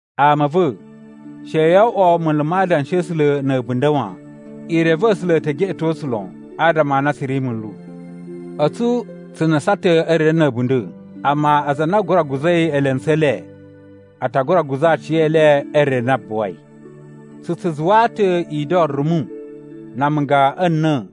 Ama a̱ va̱, she yo oꞌwo munlu ma Adanshi a̱ A̱sula̱ na̱ a̱bunda̱ wan. I reve A̱sula̱ e te geꞌeto tsu lon adama a na tsu ri munlu. A̱tsu tsu nusan ta̱ e re na̱ a̱bunda̱, amma aza a na a gura guza̱i elentsu e le, a ta gura guza̱ aciyele e re na buwai. Tsu tsu zuwaa ta̱ ido rumu na amunga a̱ na̱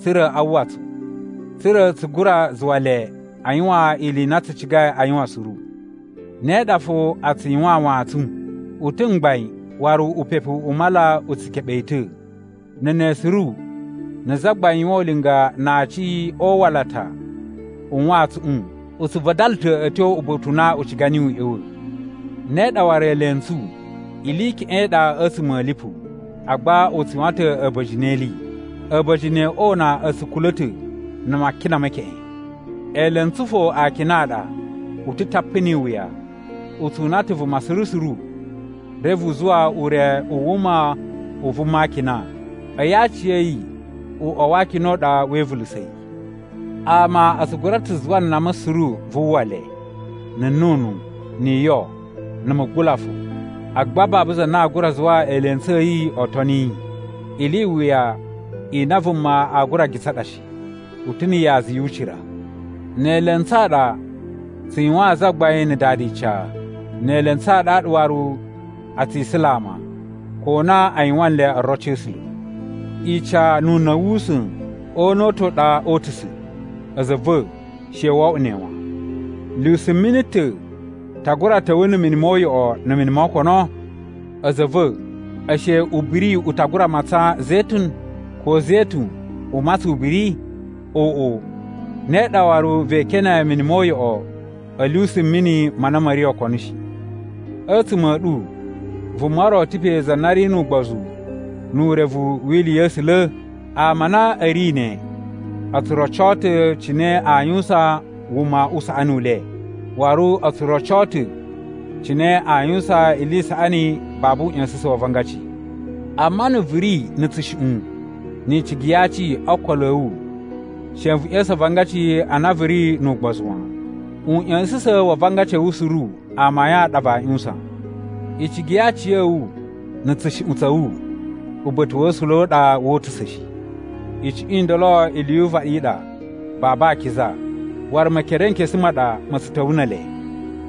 tsa̱ra̱ a uwwa tsu, tsa̱ra̱ tsu gura zuwa le a yuwan ili i na tsu cigai a yuwan suru. Ne ɗa fo a tsu yuwaan wantsun. U ta̱ mgbain waru upepu u mala u tsu keɓe yi ta̱. Na̱ ne suru na̱ zagbain yuwan ulinga na aaci o uwalata u wantsuꞌun u tsu vadala ta̱ a̱ tyo uba̱ta̱ u na u ciga niyi u ꞌya̱wa̱. Ne ɗa waru eelentsu, ili i keꞌen i ɗa a̱tsuma̱ a̱ lipu, agba u tsu yuwan ta̱ a̱ba̱jini e ili. A̱ba̱jini o una a̱ tsu kula̱ ta̱ na̱ makina me keꞌen. Eelentsu fo akina a ɗa. U ta̱ tapu ni iwuya, u tsu una ta̱ vuma suru suru, reve u zuwa ure u wuma u vuma a akina, a̱yi aciya̱yi uꞌwa wa akina u ɗa we ivulusa̱ yi. Ama a tsu gura ta̱ zuwa nama suru vu uwwa le, na̱ nnunu, ni iyo, na̱ mugula fo, agba babu za na aa gura zuwa eelentsu a̱ yi oo toni yi. Ili i wuya i na vuma aa gura gitsa ɗa shi. U ta̱ na̱ yaza yu ucira. Ne eelentsu a ɗa tsu yuwaan Zagbain na̱ Dada ica. Ne eelentsu a ɗaɗa waru a tsi isula ama, ko na a yuwan nle oroci a̱ A̱sula̱. Ica nu una̱ wu usa̱n, o una̱ u ta̱ u ɗa oo utusa̱, a̱za̱ a̱ va̱, she wo oꞌwo ne wan. Lyusumini ta̱ ta gura ta̱wa̱ na̱ mini mo uyoꞌo na̱ mini mo okono? A̱za̱ a̱ va̱, ashe ubiri u ta gura matsan zetun? Ko zetun u matsan ubiri? Oꞌo, ne ɗa waru vee kene mini mo uyoꞌo a̱ lyusumini ma na ma̱ ri okono shi. A̱tsuma̱ a̱ ɗu, vuma ro ta̱ pe za na ri nu ugbozu nu urevu wi ili ya̱ A̱sula̱? Ama a na a̱ ri ne, o tsu rocoo ta̱ cine aa yuwusan wuma u saꞌani u le, waru o tsu rocoo ta̱ cine aa yuwusan ili i saꞌani babu uꞌya̱sa̱sa̱n wa avangaci. Amma na̱ vu ri na̱ tsushuꞌun ni icigi ya aci o ookolo a̱ wu, she vu ꞌya̱sa̱n avangaci a na vu ri nu ugbozu wan. Uꞌya̱sa̱sa̱n wa avangaci a̱ wu suru amayun a ɗa vaa ꞌyuwusan. Icigi ya aciya̱wu, na̱ tsushuꞌun tsa̱ wu uba̱ta̱ wa̱ A̱sula̱ a ɗa wo utusa̱ shi. Icuꞌun i ndolo ili yu uvaɗi i ɗa, babu akiza, waru Mekerenkesu ma ɗa ma̱ tsu ta̱wa̱ ne ele.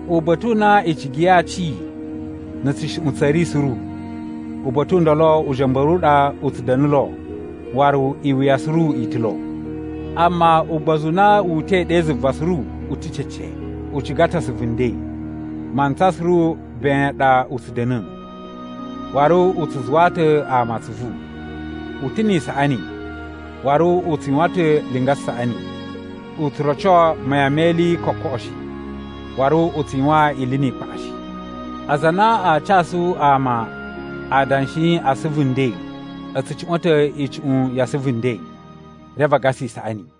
Uba̱ta̱ u na icigi ya aci na̱ tsushuꞌun tsa̱ ri suru, uba̱ta̱ u ndolo uja̱mba̱ru u ɗa u tsu da̱na̱ lo waru iwuya suru i ta̱ lo. Amma ugbozu u na wu uta̱i ɗe zuva suru u ta̱ cece. U ciga ta̱ asuvu nden. Mantsa suru ben ɗa u tsu da̱na̱, waru u tsu zuwaa ta̱ ama atsuvu. U ta̱ ni isaꞌani, waru u tsu yuwan ta̱ linga saꞌani. U tsu roco mayan me ili kokoꞌo shi, waru u tsu yuwan ili ni ikpaꞌa shi. Aza a na aa casu ama adanshi a asuvu nden a̱ tsu cuꞌwa̱n ta̱ icuꞌun ya asuvu nden, reve a gasa isaꞌani.